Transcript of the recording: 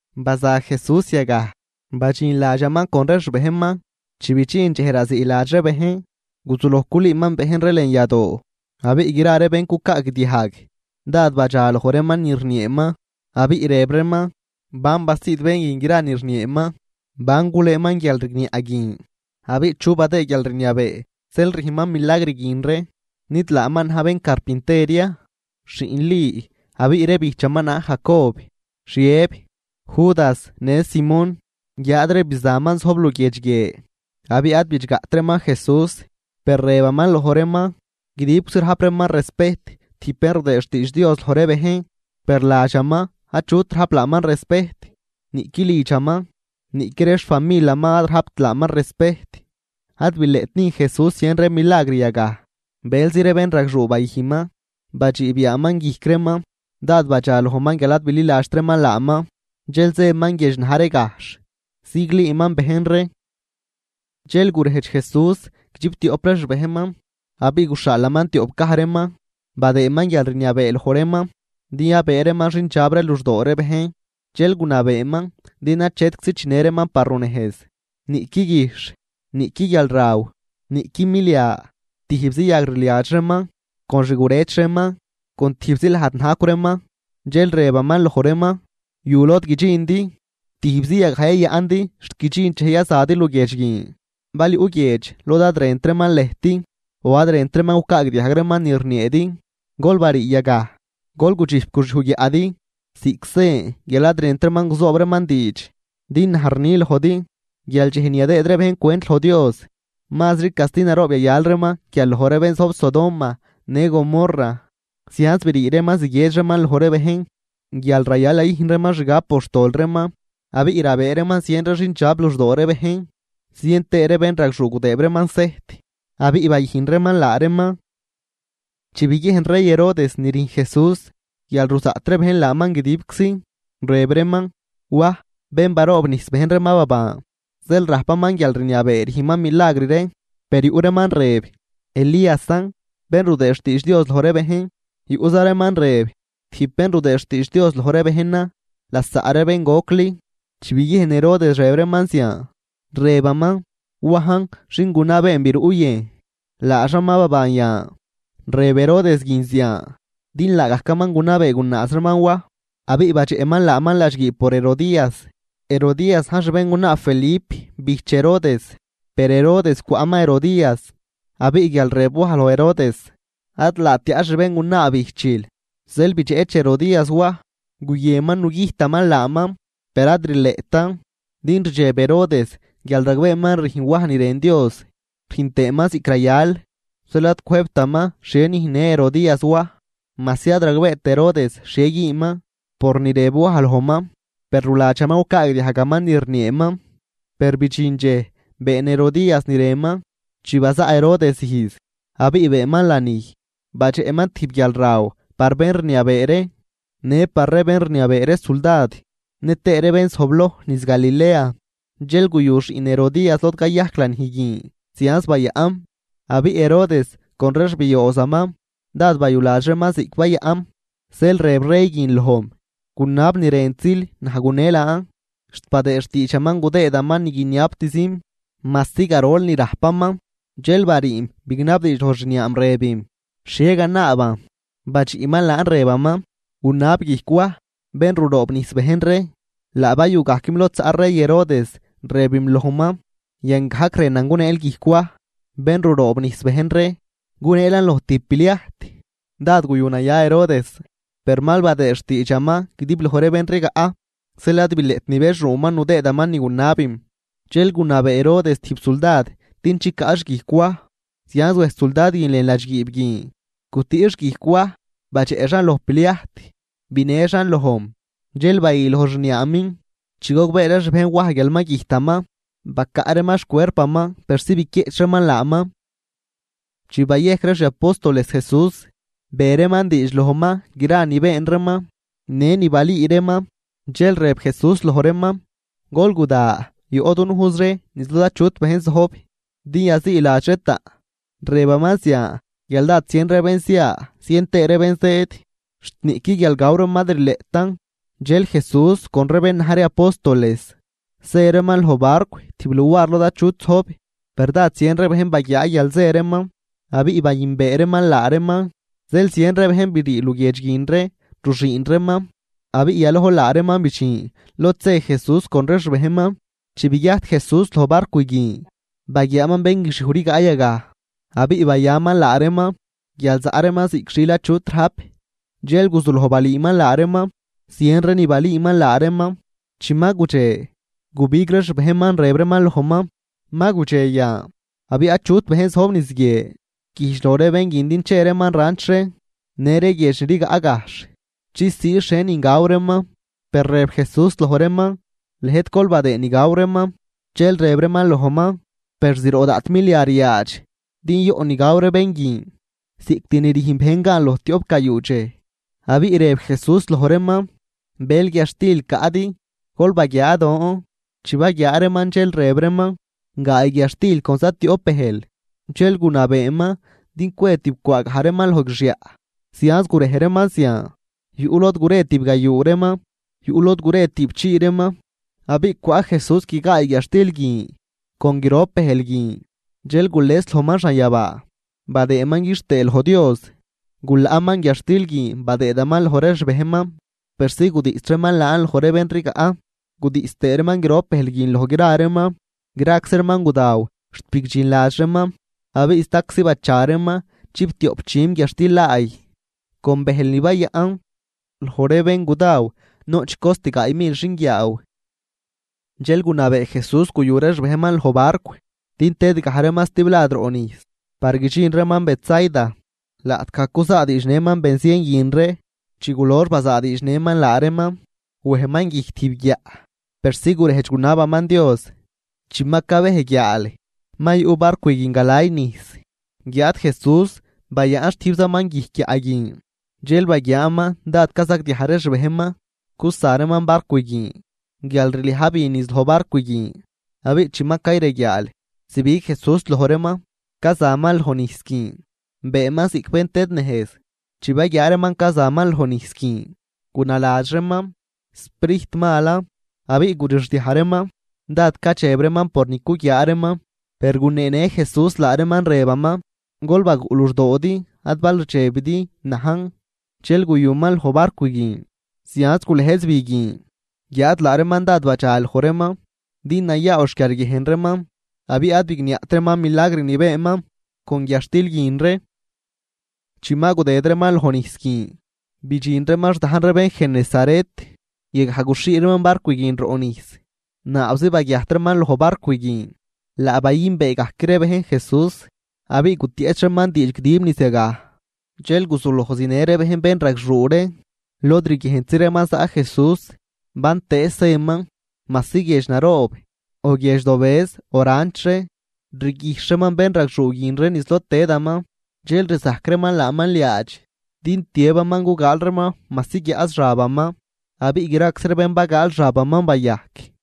Baza Jesús yagaj, badxin ladxaman con ree xbejnman. Chi bidxin dxej raziiladx ree bejn, guzuloj culüüman bejn ree lën yadoo. Abiꞌ gra ree bén cucaagdiajg dád badxa loj reeman ni rnieeman, abiꞌ rëb reeman: ―¿Ban basiid bén guin gra ni rnieeman? ¿Ban gulëëman guialrigniaꞌ guin abiꞌ chu badëë guialrniabee zeel rüjnman milagr guin ree? ¿Nid laaman na̱j bén carpinter ya, xiꞌn Li abiꞌ ree bijchaman na̱j Jacob, Xiëb, Judas, në Simón? Guiáad ree bizanman zojb luguiedx guie. Abiꞌ ad bidxgaꞌt reeman Jesús. Per rëbaman loj reeman: ―Guidibczi rajp reeman respejt tijb bén rudëë xtiidx Dios loj ree bejn. Per ladxaman achut rajp laaman respejt, niꞌqui lidxaman, niꞌqui ree xfamilaman ad rajpt laaman respejt. Ad bileꞌt nüjn Jesús zien ree milagr yagaj. Bëlzi ree bénragxuu bayüjnman, badxiib yaaman guijc reeman. Dád badxalojman guial ad bililadxt reeman laaman. Dxel zëman guiedx na̱j ree gajxh, ziglüüman bejn ree. Dxel gurejdx Jesús guidxiptioꞌp ree xbejnman, abiꞌ guxhaalaman tioꞌp gaj reeman. Badëëman guialrniabee loj reeman din yabëë reeman xindxab ree luxdoo ree bejn. Dxel gunabeeman din achetczi chinë reeman par runejz, niꞌqui guijxh, niꞌqui guialraw, niꞌqui milia, tijbzi yagrliadx reeman, con xgurëch reeman, con tijbzi lajd najcw reeman. Dxel rëbaman loj reeman: ―Yu lod guidxindi, tijbzi yagaj yayaꞌndi xt guidxin dxej yazadi luguiedx guin. Bal yuꞌ guiedx lod ad rënt reeman lëjt o ad rënt reeman gucaagdiajg reeman ni rnieedi, gol barii yagaj, gol gudxijp guxyuj guiaꞌdi ziꞌc sen guial ad rënt reeman guzoob reeman diidx. Din naj rni lojdi, guial dxej ni yadëëd ree bejn cwent loj Dios mazri casti naroob yayal reeman guial loj ree bén Sodoma në Gomorra. Zianz brii reeman ziguiedx reeman loj ree bejn guial rayal yayüjn reeman xgab por xtol reeman. Abiꞌ rabëë reeman zien ree xindxab luxdoo ree bejn, zien tëë ree bénragxuu gudëëb reeman sejt, abiꞌ bayüjn reeman laa reeman. Chi biguiejn rey Herodes ni rüjn Jesús guial ruzaꞌt ree bejn laaman guidibczi, rëb reeman: ―Waj, bén baroobnijs bejn ree ma baban, zeel rajpaman guialrniabee rüjnman milagr ree. Per yuꞌ reeman rëb: ―Elíasan, bén rudëë xtiidx Dios loj ree bejn. Yuꞌza reeman rëb: ―Tijb bén rudëë xtiidx Dios loj ree bejnan lasaꞌ ree bén gocli. Chi biguiejn Herodes rëb reeman zian, rëbaman: ―Wajn, xin gunabeen biruꞌ yëjn, laaxan ma baban yan. Rëb Herodes guin zian din laagajcaman gunabee gunaaz reeman Waj, abiꞌ badxeꞌman laaman ladxguiib por Herodías. Herodías na̱j xbéngunaa Felip bijch Herodes. Per Herodes cwaꞌman Herodías. Abiꞌ guial rëb Waj loj Herodes: ―Ad laat tiaꞌ xbéngunaa bijchil. Zeel bidxeꞌch Herodías Waj, guyënman nugüjtaman laaman. Per ad rileꞌtan, din rdxeb Herodes guial ragbeeman rüjn Waj ni rën Dios, rüjn tëëman ziꞌc rayal, zeel ad cwëjbtaman xhie nüjnnë Herodías Waj. Majsi ad ragbeet Herodes xhie güünman por ni rëb Waj lojman, per ruladxaman gucaagdiajgaman ni rnieeman. Per bidxin dxej been Herodías ni rënman. Chi bazaꞌ Herodes ijz, abiꞌ beenman lanij, badxeꞌman tijb guialraw par bén rniabee ree në par ree bén rniabee ree suldad nëtëë ree bén zojbloj niz Galilea. Dxel guyu xiꞌn Herodías lod cayajc lanij guin zianz bayaꞌm. Abiꞌ Herodes con ree xbioozaman dád bayuladx reeman ziꞌc bayaꞌm. Zeel rëb rey guin lojm: ―Gunab ni rëntzil, naj gune laan. Xt badëë xtiidxaman gudëëman ni guiniabtzim, majsi garol ni rajpaman. Dxel bariim bignabdiidx loj xniaam, rëbim: ―¿Xhie ganaaban? Badxiꞌman laan rëbaman: ―Gunab guijc Waj bén ruroobnijs bejn ree. Laa bayugajquim lod zaꞌ rey Herodes, rëbim lojman: ―Yan gajc rënan guneel guijc Waj, bén ruroobnijs bejn ree, guneelan loj tijb pliajt. Dád guyu naya Herodes, per mal badëëd xtiidxaman guidib loj ree bén rigaꞌ, zeel ad bileꞌt nibexuuman nudëëman ni gunabim. Dxel gunabee Herodes tijb suldad din chicaꞌx guijc Waj. Zianz wej suldad guin lën ladxguiib guin, gutüꞌx guijc Waj badxeꞌxan loj pliajt binëxan lojm. Dxel bayü loj xniaamin. Chi gogbee ree xbejn Waj guial ma güjtaman, bacaꞌ reeman xcuerpaman persi biquieꞌch reeman laaman. Chi bayejc ree xi apóstoles Jesús, be reeman diidx lojman gra ni been reeman në ni balüü reeman. Dxel rëb Jesús loj reeman: ―Gol guda, yoꞌ dunujz ree niz lod achut bejn zojb din yaziiladx ree taꞌn. Rëbaman zian guial dád zien ree bén zia zien tëë ree bén zëëd, xt niꞌqui guial gaw reeman ad rileꞌtan. Dxel Jesús con ree bén na̱j ree apóstoles zë reeman loj barcw tijb luar lod achut zojb. Per dád zien ree bejn baguiaa guial zë reeman, abiꞌ bayünbee reeman laa reeman zeel zien ree bejn brii luguiedx guin ree ruxüün reeman, abiꞌ yalojl laa reeman bidxin lod zë Jesús con ree xbejnman. Chi baguiajt Jesús loj barcw guin, baguiaaman bén guixiuj rigaꞌ yagaj, abiꞌ bayaman laa reeman guial zaꞌ reeman ziꞌc xiil achut rajp. Dxel guzuloj balüüman laa reeman, zien ree ni balüüman laa reeman. Chi ma gudxe, gubig ree xbejnman, rëb reeman lojman: ―Ma gudxe yan, abiꞌ achut bejn zojb niz guie. Güjdx loj ree bén guin din che reeman ranch ree në ree guiedx ni rigaꞌ gajxh chisii xhienin gaw reeman. Per rëb Jesús loj reeman: ―Lëjt gol badëëd ni gaw reeman. Dxel rëb reeman lojman: ―Per zroꞌ daꞌt milia ryaadx din yoꞌ ni gaw ree bén guin, ziꞌct ni rüjn bejn gan loj tioꞌp gayuu dxej. Abiꞌ rëb Jesús loj reeman: ―¿Bël guiadxtil caꞌdi? Gol baguiaa don. Chi baguiaa reeman, dxel rëb reeman: ―Gaay guiadxtil con zatioꞌp bëjl. Dxel gunabeeman din cwe tibcwaa gaj reeman loj guixyaꞌ. Zianz gurej reeman zian, yuꞌ lod gure tibgayuu reeman, yuꞌ lod gure tüꞌpchii reeman. Abiꞌ cwaꞌ Jesús guigaay guiadxtil guin con grop bëjl guin. Dxel gules lojman xanyabaa, badëëman quixtëë loj Dios, gulaꞌman guiadxtil guin badëëman loj ree xbejnman persi gudiꞌs reeman laan loj ree bén rigaꞌ, gudiꞌs tëëman grop bëjl guin loj gra reeman. Graczi reeman gudaw xt bigdxinladx reeman, abiꞌ staczi bacha reeman chiptioꞌp dxüm guiadxtil laay con bëjl ni bayaꞌn. Loj ree bén gudaw noꞌch cost gaay mil xinguiaaw. Dxel gunabee Jesús guyu ree xbejnman loj barcw din tëdgaj reeman stiblad roꞌ nijs par guidxin reeman Betsaida, laꞌtgaj cuzaadiidxnëman benzien guin ree. Chi gulox bazaadiidxnëman laa reeman, wejman guijc tijb guiaꞌ, persi gurejdx gunabaman Dios. Chi ma cabej guiaal, ma yuꞌ barcw guin galay nijs guiáad Jesús bayaꞌn xtijbzaman guijc guiaꞌ guin. Dxel baguiaaman dád cazagdiaj ree xbejnman cusa reeman barcw guin guial rliaj bi niz loj barcw guin. Abiꞌ chi ma cayreguiaal zibig Jesús loj reeman cazaman loj nijs guin, beenman ziꞌc bén tëdnejz. Chi baguiaa reeman cazaman loj nijs guin gunaladx reeman sprijt malan, abiꞌ gurixdiaj reeman. Dád cadxeb reeman por ni cuguiaa reeman. Per guneenë Jesús laa reeman rëbaman: ―¡Gol baguꞌ luxdoodi, ad bal rdxebidi, najn! Dxel guyuman loj barcw guin, zianz gulëjz bi guin. Guiáad laa reeman dád badxa loj reeman, din nayaaw xquiarguiejn reeman, abiꞌ ad bigniaꞌt reeman milagr ni beenman con guiadxtil guin ree. Chi ma gudëd reeman lojnijs guin bidxin reeman xdajn ree bén Genesaret, yagaj guxhii reeman barcw guin roꞌ nijs. Naabzi baguiajt reeman loj barcw guin, laa bayünbee gajc ree bejn Jesús. Abiꞌ gutieꞌch reeman diidx guidib niz yagaj. Dxel guzuloj zinë ree bejn bénragxuu ree lod riguiejntzi reeman zaꞌ Jesús. Bantëëz zëman, majsi guiedx naroob o guiedx dobëz o ranch ree, rguijxh reeman bénragxuu guin ree niz lod tëdaman. Dxel rzajc reeman laaman liaadx din tiëbaman gugaal reeman majsi guiaꞌz xabaman. Abiꞌ graczi ree bén bagaal xabaman bayajc.